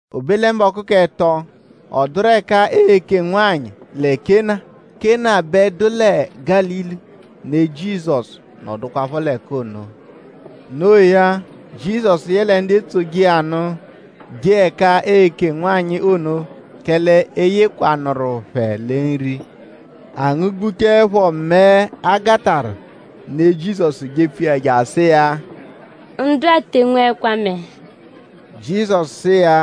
O be lẹ mbọku k'ẹto; ọ dụru ẹka eeke nwanyị lẹ Kena. Kena bẹ dụ lẹ Gálili. Ne Jizọsu nọdukwapho l'ẹka ono. No iya; Jizọsu yẹle ndu etsoje iya nụ jee ẹka eeke nwanyị ono; kẹle e yekwanụru phẹ lẹ nri. A ngụ-gbuchaẹpho mẹe, a gatarụ; ne Jizọsu jepfu iya je asụ iya: “Ndu-a te enweẹkwa mẹe.” Jizọsu sụ iya: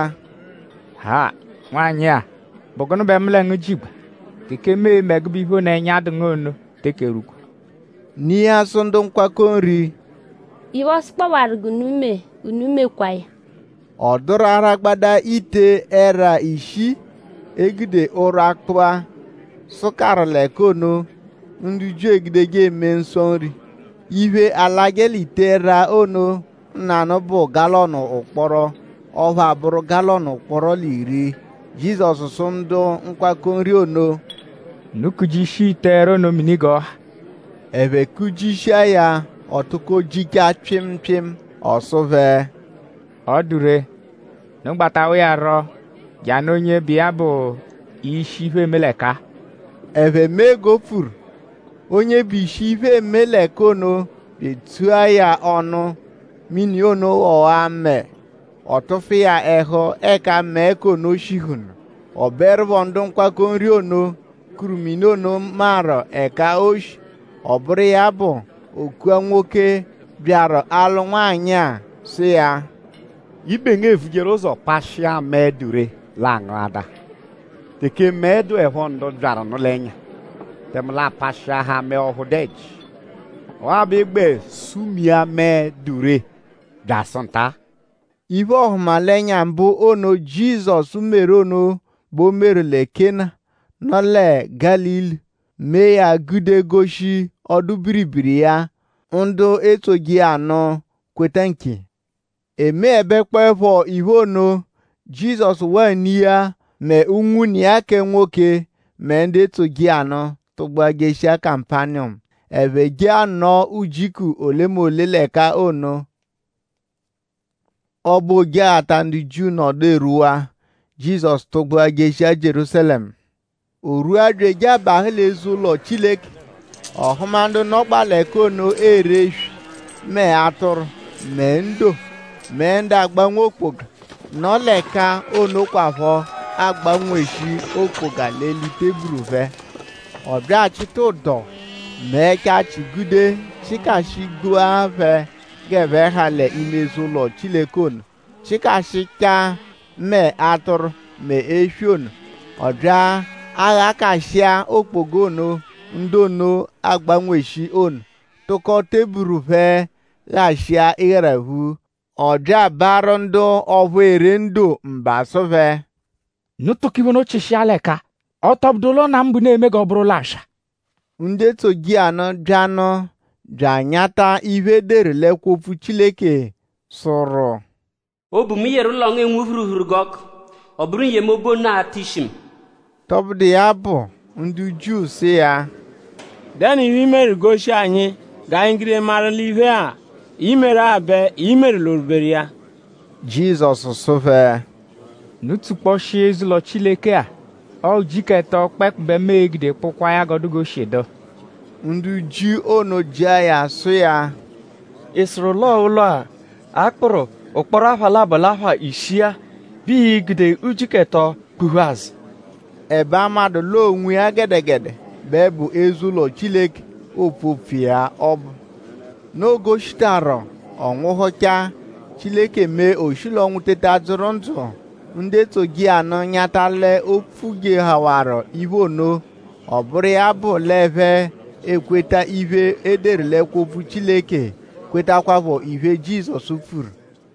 “Ha! Nwanyị-a!?Bụ gụnu bẹ mu lẹ ngu jigba? Teke mu e-me ẹgube iphe ono, ẹnya dụ ngu ono teke erwukwa.” Ne iya sụ ndu nkwakọ nri: “Iphe, ọ sụkpowaru g'unu mee; unu mekwaa ya!” Ọ dụru aragbada ite-ẹra ishii, e gude ụrwa kpụa, sụkaaru l'ẹka ono, ndu Jiu egudeje eme nsọ nri. Iphe, alajẹ l'ite-ẹra ono nanụ bụ galọnu ụkporo; ọphu abụru galọnu ụkporo l'iri. Jizọsu sụ ndu nkwakọ nri ono: “Unu kujishia ite-ẹra ono mini g'ọ ha.” Ẹphe kujishia ya; ọ tụko jichaa pyịmu pyịmu. Ọ sụ phẹ: “Ọ dụ ree; unu gbatawa iya rọ je anụ onye bụ iya bụ ishi, iphe, eeme l'ẹka-a.” Ẹphe mee g'o pfuru. Onye bụ ishi iphe, eeme l'ẹka ono bya etsua ya ọnu; mini ono ghọwaa mẹe. Ọ tụfu iya ẹhu ẹka mẹe k'ono shihunu. Ọ bụerupho ndu nkwakọ nri ono, kuru mini ono maru ẹka o shi. Ọ bụru iya bụ; o kua nwoke, byaru alụ nwanyị-a sụ iya: “Ibe ngu evujeru ụzo pashịa mẹe, dụ ree l'a ngụadaa. Teke mẹe dụepho ndu byaru nụ l'ẹnya; tẹme l'a pashịahaa mẹe ọphu dụ ẹji. Ọwa bẹ ị gbẹ sumia mẹe, dụ ree byasụ nta-a.” Iphe-ọhumalenya mbụ ono, Jizọsu meru ono bẹ o meru lẹ Kena, nọ lẹ Gálili; mee ya gude goshi ọdu-biribiri iya. Ndu etsoje iya nụ kweta nkiya. E meẹbekpoepho iphe ono; Jizọsu waa ne iya; mẹ unwune iya kẹ nwoke; mẹ ndu etsoje iya nụ tụgbua jeshia Kapaniyọmu. Ẹphe je anọo nwujiku olemole l'ẹka ono. Ọbo Ojeghata ndu Jiu nọdu erwuwaa; Jizọsu tụgbua jeshia Jierúsalẹmu. O rwua bya eje abahụ l'eze-ụlo Chileke. Ọ hụma ndu nọgbaa l'ẹka ono ere eswi; mẹ atụru; mẹ ndo; mẹ ndu agbanwe okpoga, nọ l'ẹka onokwaphọ agbanweshi okpoga l'eli teburu phẹ. Ọ bya achịta ụdo; mee ẹchachi gude chịkashigbua phẹ g'ẹphe ha l'ime eze-ụlo Chileke ono; chịkashichaa mẹ atụru mẹ eswi ono. Ọ bya aghakashịa okpoga ono, ndu ono agbanweshi ono; tụko teburu phẹ ghashịa ịgharaphu. Ọ bya abaarụ ndu ọphu ere ndo mba sụ phẹ: “Unu tụko iphe ono chịshia l'ẹka-a. Ọ tọ bụdu ụlo Nna mu bẹ unu e-me g'ọ bụru ụlo aswa.” Ndu etsoje iya nụ bya nụ bya anyata iphe, e deru l'ẹkwo-opfu Chileke, sụru: “Obu, mu yeru ụlo ngu enwu phuruphuru g'ọku; ọ bụru n-yemobu ono a-ta ishi mu.” Tọbudu iya bụ; ndu Jiu sụ iya: “?Dẹnu iphe, ii-meru goshi anyi g'anyi gude maru l'iphe-a, i meru-a bẹ i meru l'orwuberu iya?” Jizọsu sụ phẹ: “Unu tsukpọshia eze-ụlo Chileke-a; ọo ujiku ẹto kpẹekpu bẹ mu e-gude kpụkwaa ya g'ọ dụ g'o shi dụ.” Ndu Jiu ono jịa ya sụ iya: “?Ị sụru l'ọo ụlo-a, a kpụru ụkporo apha labọ l'apha ishii-a bẹ ii-gude ujiku ẹto kpụ-phu azụ?” Ẹbe a madụ l'ọo onwiya gẹdegede bẹ bụ eze-ụlo Chileke, oopfu opfu iya ọbu. Noo g'o shitaru ọ nwụhuchaa; Chileke mee o shi l'ọnwu teta dzụru ndzụ; ndu etsoje iya nụ nyata l'o pfujewaru iphe ono. Ọ bụru iya bụ l'ẹphe ekweta iphe, e deru l'ẹkwo-opfu Chileke; kwetakwaphọ iphe, Jizọsu pfuru.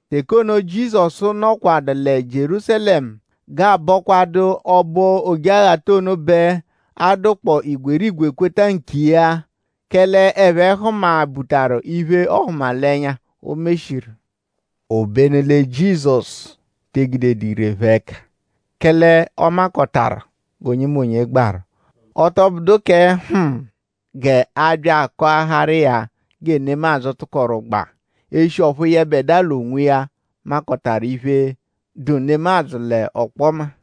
Teke ono, Jizọsu nọkwadu lẹ Jierúsalẹmu g'aabọkwadu ọbo Ojeghata ono bẹ a dụkpoo igwerigwe kweta nkiya. Kẹle ẹphe hụma-butaru iphe-ọhumalenya, o meshiru. Obenu lẹ Jizọsu te egudedu ire phẹ ẹka; kẹle ọ makọtawaru g'onyemonye gbaru. Ọ tọ bụdu kẹ hm g'a bya akọaharu iya gẹ nemadzụ tụkoru gbaa; eshi ọphu yẹbedua l'onwiya makọtawaru iphe, dụ nemadzụ l'ọkpoma.